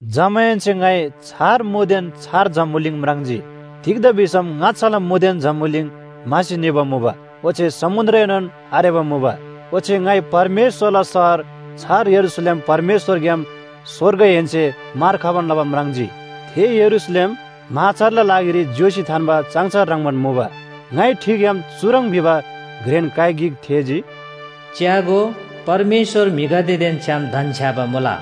जमाहेन्‍से ङाइ छार मुदेन छार जम्‍बुलिङ म्राङ्जी। तिग्‍दा भिसम ङाच्‍छाला मुदेन जम्‍बुलिङ म्‍हासी निबा मुबा, ओच्‍छे समुन्‍द्रएनोन आरेबा मुबा। ओच्‍छे ङाइ परमेश्‍वरला शहर, छार यरूशलेम परमेश्‍वरग्‍याम स्‍वर्गहेन्‍से मार खबान लबा म्राङ्जी। थे यरूशलेम म्‍हाछारला लागिरी ज्‍योसी थान्‍बा चाङछार ह्रङ्‌बान मुबा। ङाइ ठिग्‍याम चुह्रङ् भिबा घ्रेन काइ गिक थेःजी, “च्‍यागो, परमेश्‍वर म्‍हिगदेदेन छ्‌याम धन्‍छ्‌याबा मुला।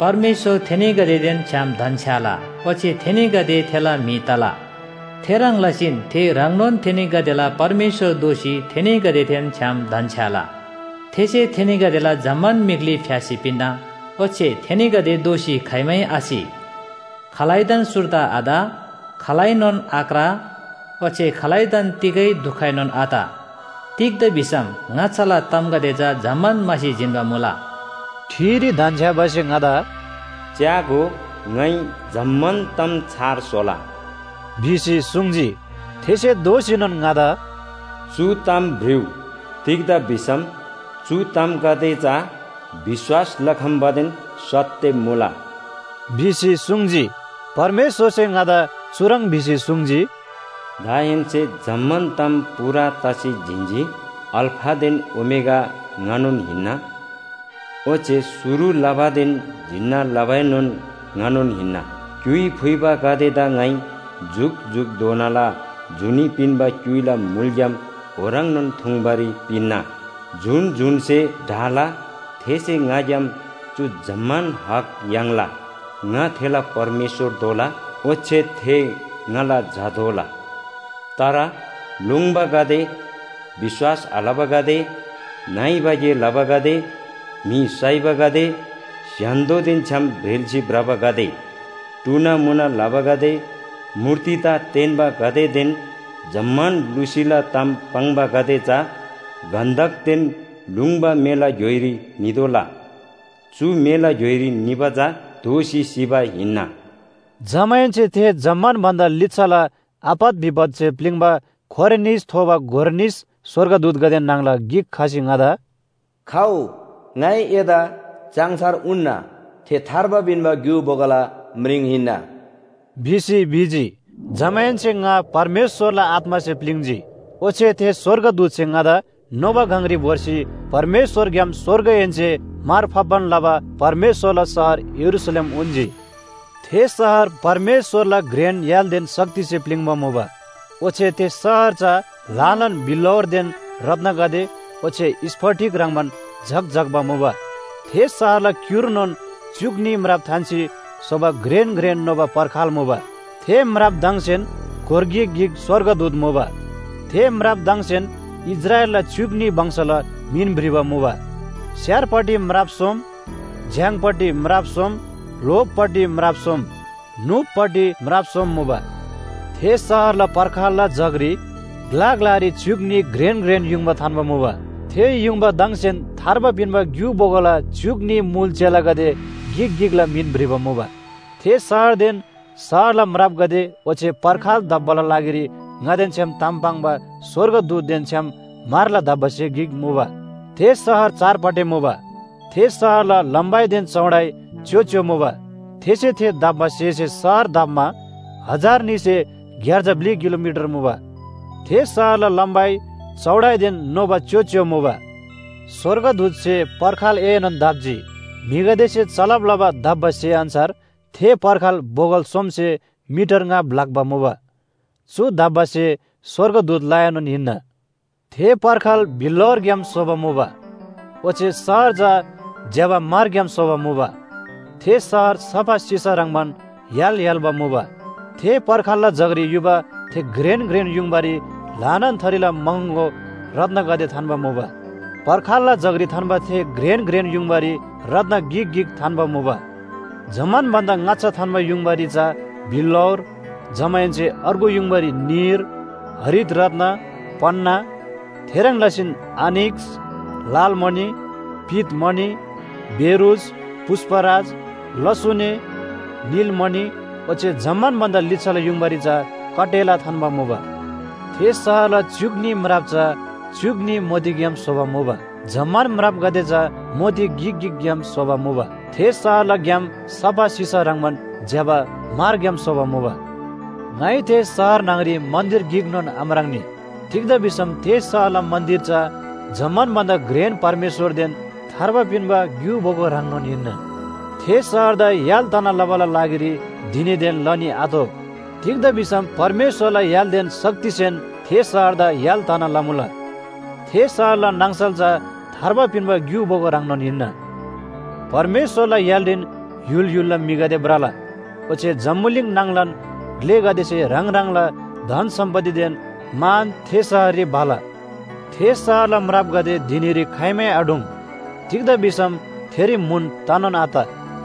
परमेश्‍वर थेनीगदेदेन छ्‌याम धन्‍छ्‌याला ओच्‍छे थेनीगदे थेला म्‍हि तला। थेह्रङ् लसीन थे ह्राङनोन थेनीगदेला परमेश्‍वर दोःसी थेनीगदेदेन छ्‌याम धन्‍छ्‌याला। थेसे थेनीगदेला जम्‍मान मीख्‍ली फ्‍यासी पिन्‍ना। ओच्‍छे थेनीगदे दोःसी खाइमै आसि, खालैदान सुर्दा आत, खालैनोन आक्रा, ओच्‍छे खालैदान तिगै दुखएनोन आत। तिग्‍दा भिसम ङाच्‍छाला तामगदे चा जम्‍मान म्‍हासी जिन्‍बा मुला। ठिरी धन्‍छ्‌याबासे ङादा “च्‍यागो, ङाइ जम्‍मान ताम छार स्‍होला” भिसी सुङ्जी। थेसे दोःसीनोन ङादा “चु ताम भ्रिउ, तिग्‍दा भिसम चु तामगदे चा विश्‍वास लखम्‍बादेन सत्‍य मुला” भिसी सुङ्जी। परमेश्‍वरसे ङादा चुह्रङ् भिसी सुङ्जी, “दाहेन्‍से जम्‍मान ताम पूरा तसी जिन्‍जी। अल्‍फादेन ओमेगा ङानोन हिन्‍ना, ओच्‍छे शुरु लबादेन जिन्‍ना लबाएनोन ङानोन हिन्‍ना। क्‍युइ फुइबागदेदा ङाइ जुकजुकधोनाला जुनी पिन्‍बा क्‍युइला मुलग्‍याम ओह्रङ्नोन थुङ्बारी पिन्‍ना। जुन जुनसे ढाला थेसे ङाग्‍याम चु जम्‍मान हक याङ्ला। ङा थेला परमेश्‍वर दोला ओच्‍छे थे ङाला झा दोला। तर लोङ्‌बागदे, विश्‍वास आलबागदे, नइबा गे लबागदे, म्‍हि साइबागदे, स्‍य्‍हान्‍दोदेन छ्‌याम ब्रेल्‍सी भ्रबागदे, टुनामुना लबागदे, मूर्तिदा तेन्‍बागदेदेन जम्‍मान लुसीला ताम पाङ्बागदे चा गन्‍धकदेन लुङ्बा मेला घ्‍योइरी नितोःला। चु मेला घ्‍योइरी निबा चा दोःसी सिबा हिन्‍ना। जमाहेन्‍से थे जम्‍मान भन्‍दा लिच्‍छाला आपत विपतसे प्‍लिङ्बा खोरे निस थोबा गोर निस स्‍वर्गदूतगदे न्‍हङला गिक खसी ङादा “खउ, ङाइ एदा चाङछार उन्‍ना, थे थार्बा पिन्‍बा ग्‍यु बोगोला म्रिङ हिन्‍ना” भिसी भिजी। जमाहेन्‍से ङा परमेश्‍वरला आत्‍मासे प्‍लिङ्‌जी। ओच्‍छे थे स्‍वर्गदूतसे ङादा नोबा गङरी भोर्सी परमेश्‍वरग्‍याम स्‍वर्गहेन्‍से मार फाप्‍बान लबा परमेश्‍वरला शहर यरूशलेम उन्‍जी। थे शहर परमेश्‍वरला घ्रेन य्‍हालदेन शक्तिसे प्‍लिङ्बा मुबा। ओच्‍छे थे शहर चा ल्‍हानान बिल्‍लौरदेन रत्‍नगदे ओच्‍छे स्‍फटिक ह्रङ्‌बान झक्‍झक्‍बा मुबा। थे शहरला क्‍युर्नोन च्‍युक न्‍ही म्राप थान्‍सी स्‍होबा घ्रेन घ्रेन नोबा पर्खाल मुबा। थे म्रापदङसेन गोर गिक गिक स्‍वर्गदूत मुबा। थे म्रापदङसेन इस्राएलला च्‍युक न्‍ही वंशला मिन भ्रिबा मुबा। स्‍यारपट्टि म्राप सोम, झ्‍याङपट्टि म्राप सोम ल्‍होपट्टि म्राप सोम, न्‍हुपपट्टि म्राप सोम मुबा। थे शहरला पर्खालला जगरी ग्‍ला ग्‍लारी च्‍युक न्‍ही घ्रेन घ्रेन युङबा थान्‍बा मुबा। थे युङबादङसेन थार्बा पिन्‍बा ग्‍यु बोगोला च्‍युक न्‍ही मुल चेलागदे गिक गिकला मिन भ्रिबा मुबा। थे शहरदेन शहरला म्रापगदे ओच्‍छे पर्खाल दप्‍बाला लागिरी ङादेन छ्‌याम ताम पाङ्बा स्‍वर्गदूतदेन छ्‌याम म्‍हरला दप्‍बा स्‍हे गिक मुबा। थे शहर चारपाटे मुबा। थे शहरला लम्‍बाइदेन चौडाइ च्‍योच्‍यो मुबा। थेसे थे दप्‍बा स्‍हेसे शहर दप्‍मा हजार न्‍हीसे ग्‍यार्जा ब्‍लि किलोमिटर मुबा। थे शहरला लम्‍बाइ, चौडाइदेन नोबा च्‍योच्‍यो मुबा। स्‍वर्गदूतसे पर्खालएनोन दप्‍जी। म्‍हिगदेसे चलब लबा दप्‍बा स्‍हे अन्‍छार थे पर्खाल बोगल सोमसे मिटर ङा ब्‍लाक्‍बा मुबा। चु दप्‍बा स्‍हे स्‍वर्गदूतलाएनोन हिन्‍ना। थे पर्खाल बिल्‍लौरग्‍याम स्‍होबा मुबा। ओच्‍छे शहर चा ज्‍यबा म्‍हरग्‍याम स्‍होबा मुबा। थे शहर सफा सिसा ह्रङ्‌बान य्‍हाल य्‍हाल्‍बा मुबा। थे पर्खालला जगरी युबा थे घ्रेन घ्रेन युङबारी ल्‍हानान थरीला महँगो रत्‍नगदे थान्‍बा मुबा। पर्खालला जगरी थान्‍बा थे घ्रेन घ्रेन युङबारी रत्‍न गिक गिक थान्‍बा मुबा। जम्‍मान भन्‍दा ङाच्‍छा थान्‍बा युङबारी चा बिल्‍लौर, जमाहेन्‍से अर्गु युङबारी नीर, हरित रत्‍न, पन्‍ना, थेह्रङ् लसीन आनिक्‍स, लालमणि, पीतमणि, बेरूज, पुष्‍पराज, लसुने, नीलमणि, ओच्‍छे जम्‍मान भन्‍दा लिच्‍छाला युङबारी चा कटेला थान्‍बा मुबा। थे शहरला च्‍युक न्‍ही म्राप चा च्‍युक न्‍ही मोतीग्‍याम स्‍होबा मुबा। जम्‍मान म्रापगदे चा मोती गिक गिकग्‍याम स्‍होबा मुबा। थे शहरला ग्‍याम सफा सिसा ह्रङ्‌बान ज्‍यबा म्‍हरग्‍याम स्‍होबा मुबा। ङाइ थे शहर न्‍हङरी मन्‍दिर गिकनोन आम्राङ्‌नी। तिग्‍दा भिसम थे शहरला मन्‍दिर चा जम्‍मान भन्‍दा घ्रेन परमेश्‍वरदेन थार्बा पिन्‍बा ग्‍यु बोगो ह्राङनोन हिन्‍ना। थे शहरदा य्‍हाल तना लबाला लागिरी धिनीदेन लनी आतोः। तिग्‍दा भिसम परमेश्‍वरला य्‍हालदेन शक्तिसेन थे शहरदा य्‍हाल तना लमुला। थे शहरला नाङसल चा थार्बा पिन्‍बा ग्‍यु बोगो ह्राङनोन हिन्‍ना। परमेश्‍वरला य्‍हालरीन य्‍हुल य्‍हुलला म्‍हिगदे भ्रला। ओच्‍छे जम्‍बुलिङ नाङलान ग्‍लेगदेसे ह्राङ ह्राङला धन सम्‍पत्तिदेन मान थे शहररी भला। थे शहरला म्रापगदे धिनीरी खाइमै आढुङ्, तिग्‍दा भिसम थेरी म्‍हुन तनोन आत।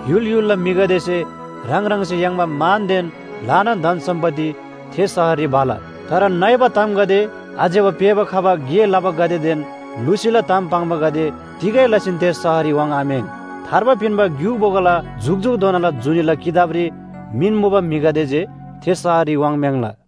य्‍हुल य्‍हुलला म्‍हिगदेसे ह्राङ ह्राङसे याङ्बा मानदेन ल्‍हानान धन सम्‍पत्ति थे शहररी भला। तर नइबा तामगदे, आज्‍यबा पेःबा खबा गे लबागदेदेन लुसीला ताम पाङ्बागदे तिगै लसीन थे शहररी वाङ्‌आम्‍याङ्। थार्बा पिन्‍बा ग्‍यु बोगोला जुकजुकधोनाला जुनीला किताबरी मिन मुबा म्‍हिगदे जे थे शहररी वाङ्म्‍याङ्ला।